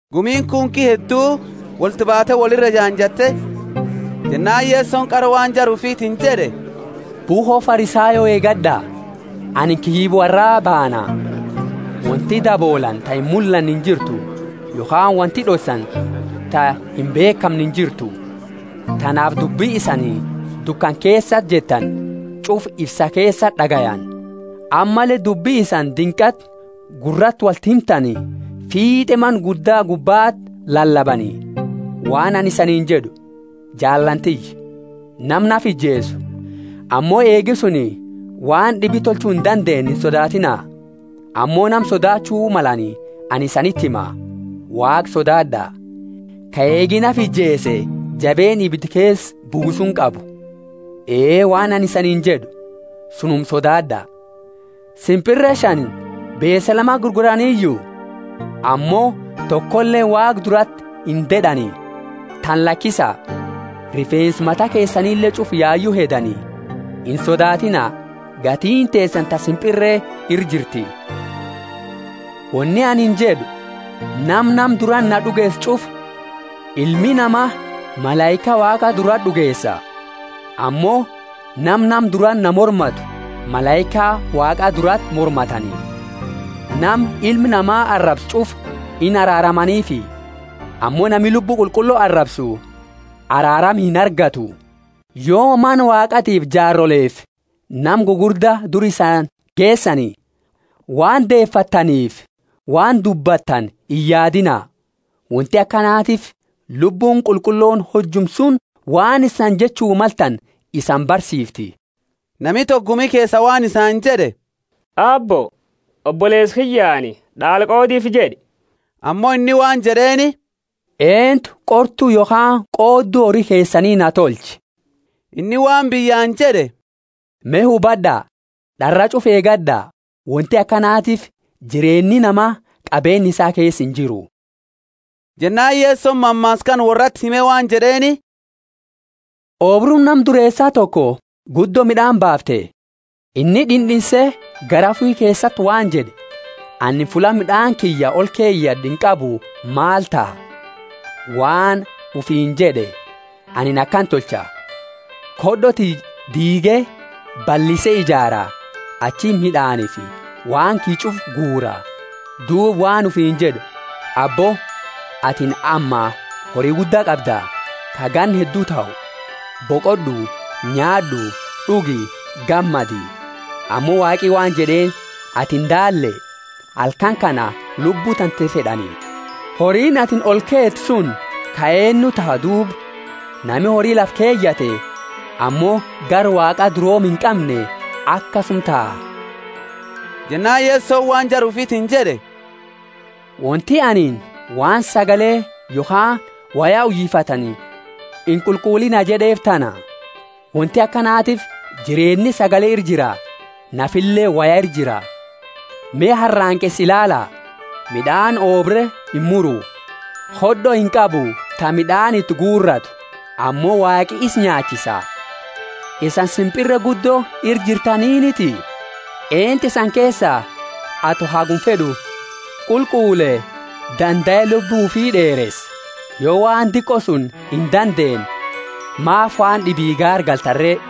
Gumiini kunki hedduu wolti baate woli ira ejaanjatte, jennaani Yesoni qara waan jara ufitiini jed'e, Bukho Farisayo eegad'a, anini kiyyiba worraa baana. Wonti daboolani ta imullanne injirtu, yokhaani wonti d'ossani ta imbeekhamne injirtu. Tanaafi dubbi isani dukana keesati jettani ch'ufa ifsa keesati d'agayani, ammalle dubbi isani dinqati gurrati wolti himtani fiit'e mana gudda gubbati lalabani. Waan anini isaniini jed'u, jaallaani tiyya, nama nafa ijeesu ammo eegi suni waan d'ibi tolchu indandeenne insodaatiina. Ammo nama sodaachu malani anini isaniti hima; Waaqa sodaad'a, ka eegi nafa ijeese jabeenna ibida keesa buusuuni qabu. Ee, waan anini isaniini jed'u, sunuma sodaad'a. Simpirreeni shani beese lamati gurguraniyu? Ammo tokole Waaqa durati inded'ani. Tana lakisa, rifeensa mata keesanile ch'ufa yayu hedani. Insodaatiina: gatiini teesani ta simpirre ira jirti. Woni anini jed'u, Nama nama durati na d'ugeesu ch'ufa Ilmi Nama malaika Waaqa durati d'ugeesa. Ammo nama nama durati na mormatu malaika Waaqa durati mormatani. Nama Ilma Nama arabsu ch'ufa inaraaramaniifi, ammo nami Lubbu Qulqullo arabsu araarama inargatu. Yo Mana Waaqatiifi jaarolefi nama gugurda dura isani geesani, waan deefattaniifi waan dubbattani iyaadiina. Wonti akanatiifi Lubbuuni Qulqullooni hojuma suni waan isani jechu maltani isani barsiifti. Nami toko gumi keesa waan isaani jed'e Aabbo, oboleesa kiyyaani, D'aala qoodiifi jed'i. Ammo inni waan jed'eeni, Eentu qortu yokhaani qoodu hori keesani naa tolche? Inni waan biyyaani jed'e, Me hubad'a, d'arraa ch'ufa eegad'a; wonti akanatiifi jireenni namaa qabeeni isaa keesa injiru. Jennaani Yesoni mammaasa kana worrati hime waan jed'eeni, Oobruuni nama dureesa toko guddo mid'aani baafte. Inni d'ind'inse garaa ufi keesati waan jed'e, Anini fulla mid'aani kiyya olkeyad'u inqabu maal taha? Waan ufiini jed'e, Anini akana tolcha; khod'o tiyya d'iige, ballise ijaara, achiti mid'aanifi waan kiyya ch'ufa guura. Duuba waan ufiini jed'u, Abbo, atini amma hori gudda qabda, ka ganna heddu tahu, boqod'u nyaad'u, d'ugi, gammadi. Ammo Waaqi waan jed'eeni, Atini daalle, halkani kana lubbu tante fed'ani; horiini atini olkeete suni ka eennu taha duuba? Nami hori lafa keyate ammo gara Waaqa durooma inqamne akasuma taha. Jennaani Yesoni waan jara ufitiini jed'e, Wonti anini, Waan sagale yokhaani woya uyifatani inqulqulliina jed'eefi tana. Wonti akanatiifi jireenni sagale ira jira, nafileeni woya ira jira. Me haranqeesa ilaala; mid'aani oobre imuru, khod'o inqabu ta mid'aani iti guuratu; ammo Waaqi isa nyaachisa. Isani simpirre guddo ira jirtaniniti? Eentu isani keesa, ato haguma fed'u qulqulle, dandae lubbu ufi d'eeresa? Yo waan diqo suni indandeenne, maafi waan d'ibii gaargaltani re?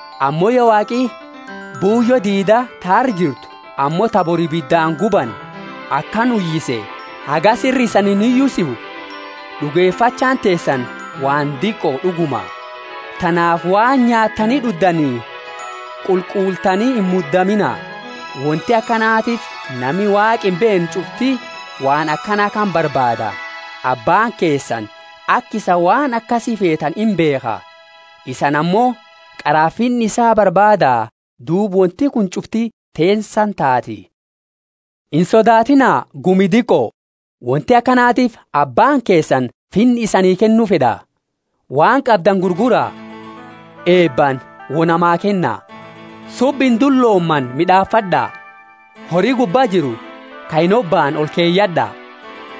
Ammo yo Waaqi buuyo diida ta arra jirtu ammo ta bori ibidaani gubani akana uyise, hagasi ira isani inuyisu? D'ugefachaani teesani waan diqo d'uguma. Tanaafi waan nyaattani d'uddani qulqulltani imudamiina. Wonti akanatiifi nami Waaqa imbeenne ch'ufti waan akana kana barbaada. Abbaani keesani aka isani waan akasi feetani imbeekha. Isani ammo qara Finna isaa barbaada, duuba wonti kuni ch'ufti teesani taati. Insodaatiina, gumi diqo! Wonti akanatiifi Abbaani keesani Finna isaa isanii kennu fed'a. Waan qabdani gurgura, eebaani wo namaa kenna. Subba indulomane mid'aafad'a, hori gubba jiru ka inhobaamne olkeyad'a,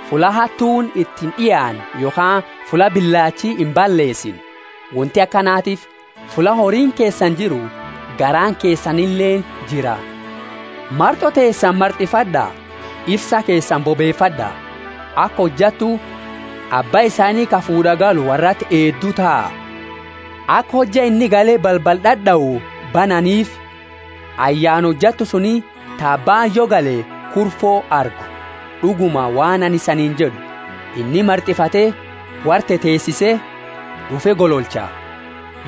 fulla hattuuni iti ind'iaanne yokhaani fulla bilaachi imballeesine. Wonti akanatiifi fulla horiini keesani jiru garaani keesanileeni jira. Mart'o teesani mart'ifad'a, ifsa keesani bobeefad'a; aka hojattu abba isaani ka fuud'a galu worrati eeddu taha, aka hojja inni gale balbala d'ad'au bananiifi. Ayyaana hojattu suni ta abbaani yo gale kurfo argu! D'uguma, waan anini isaniini jed'u, inni mart'ifate worra teteesise, d'ufe gololcha.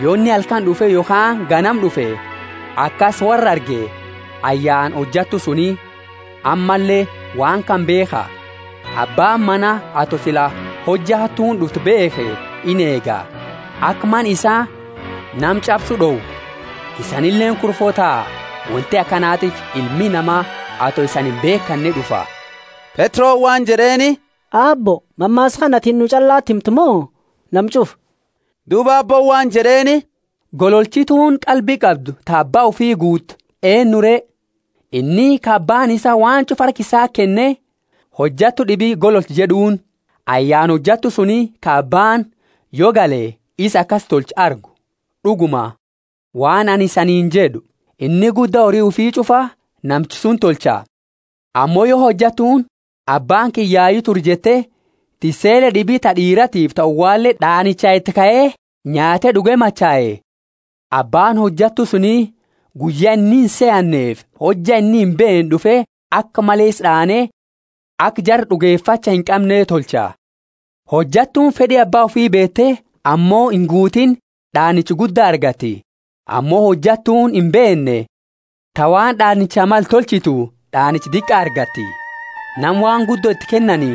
Yo inni halkani d'ufe yokhaani ganama d'ufe, akasi worra arge, ayyaana hojattu suni. Ammalle waan kana beekha, Abbaani mana ato sila hojja hattuuni d'uftu beekhe ineega, aka mana isaa nama ch'absu d'owu. Isanileeni kurfo taha; wonti akanatiifi Ilmi Nama, ato isani imbeekane d'ufa. Petroni waan jed'eeni, Aabbo, mammaasa kana atini nu ch'allati himta mo nama ch'ufa? Duuba Aabbooni waan jed'eeni, Gololchituuni qalbi qabdu ta abba ufi guute eennu re? Inni ka abbaani isaa waan ch'ufa harka isati kenne, hojattu d'ibi gololchi jed'uuni. Ayyaana hojattu suni ka abbaani, yo gale, isa akasi tolchu argu. D'uguma, waan anini isaniini jed'u, inni gudda hori ufi ch'ufa namicha suni tolcha. Ammo yo hojattuuni, abbaani kiyya yayu ture jette, tissele d'ibi ta d'iiratifi ta uwale d'aanicha iti kae, nyaate d'uge machae, abbaani hojattu suni guyya inni insehannefi hojja inni imbeenne d'ufe aka male isa d'aane, aka jara d'ugefacha inqamne tolcha. Hojattuuni fed'i abba ufi beete ammo inguutiini d'aanicha gudda argati. Ammo hojattuuni imbeenne, ta waan d'aanicha male tolchitu, d'aanicha diqa argati. Nama waan guddo iti kennani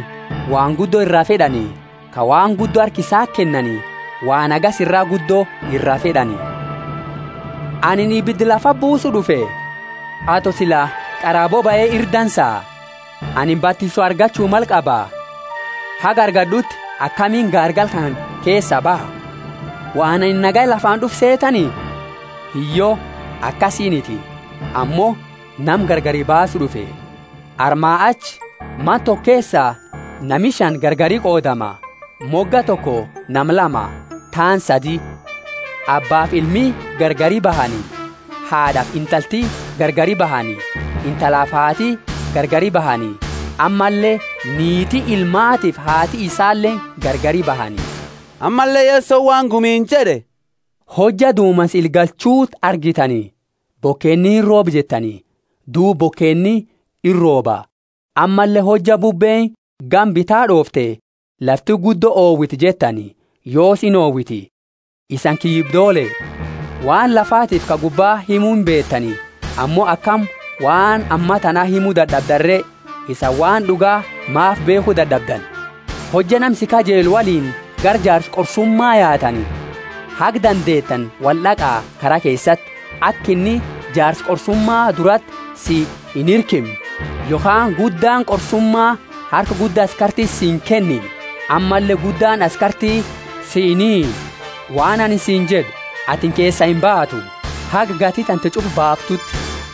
waan guddo ira fed'ani; ka waan guddo harka isati kennani waan hagasi iraa guddo iraa fed'ani. Anini ibida lafati buusu d'ufe, ato sila qara bobae ira dansa! Anini batiso argachu male qaba; haga argad'uti akamiini gaargala kana keesa baha! Waan anini nagaya lafaani d'ufe seetani? Hiyyo, akasiiniti, ammo nama gargari baasu d'ufe. Armaa achi mana toko keesa nami shani gargari qoodama, moga toko nama lama, taani sadi. Abbaafi ilmi gargari bahani, haad'afi intalti gargari bahani intalafi haati gargari bahani; ammalle niiti ilmaatiifi haati isaaleeni gargari bahani. Ammalle Yesoni waan gumiini jed'e, Hojja dumansa ila galchuuti argitani, Bokeeni irooba jettani, duuba bokeeni irooba. Ammalle hojja bubbeeni gama bita d'oofte, Lafti guddo owiti jettani, yoosi inowiti. Isani kiyyibdoole! Waan lafatiifi ka gubba himu imbeetani; ammo akami waan ammatani himu dad'abdani re? Isani waan d'uga maafi beekhu dad'abdani? Hojja nama si kajellu woliini gara jaarsa qorsuma yaatani, haga dandeetani wold'aqa kara keesati, aka inni jaarsa qorsuma durati si inhirkimne yokhaani guddaani qorsuma harka gudda askartiti si inkenine ammalle guddaani askarti si inhiinne. Waan anini siini jed'u, Atini keesaa imbaatu, haga gati tante ch'ufa baaftuuti.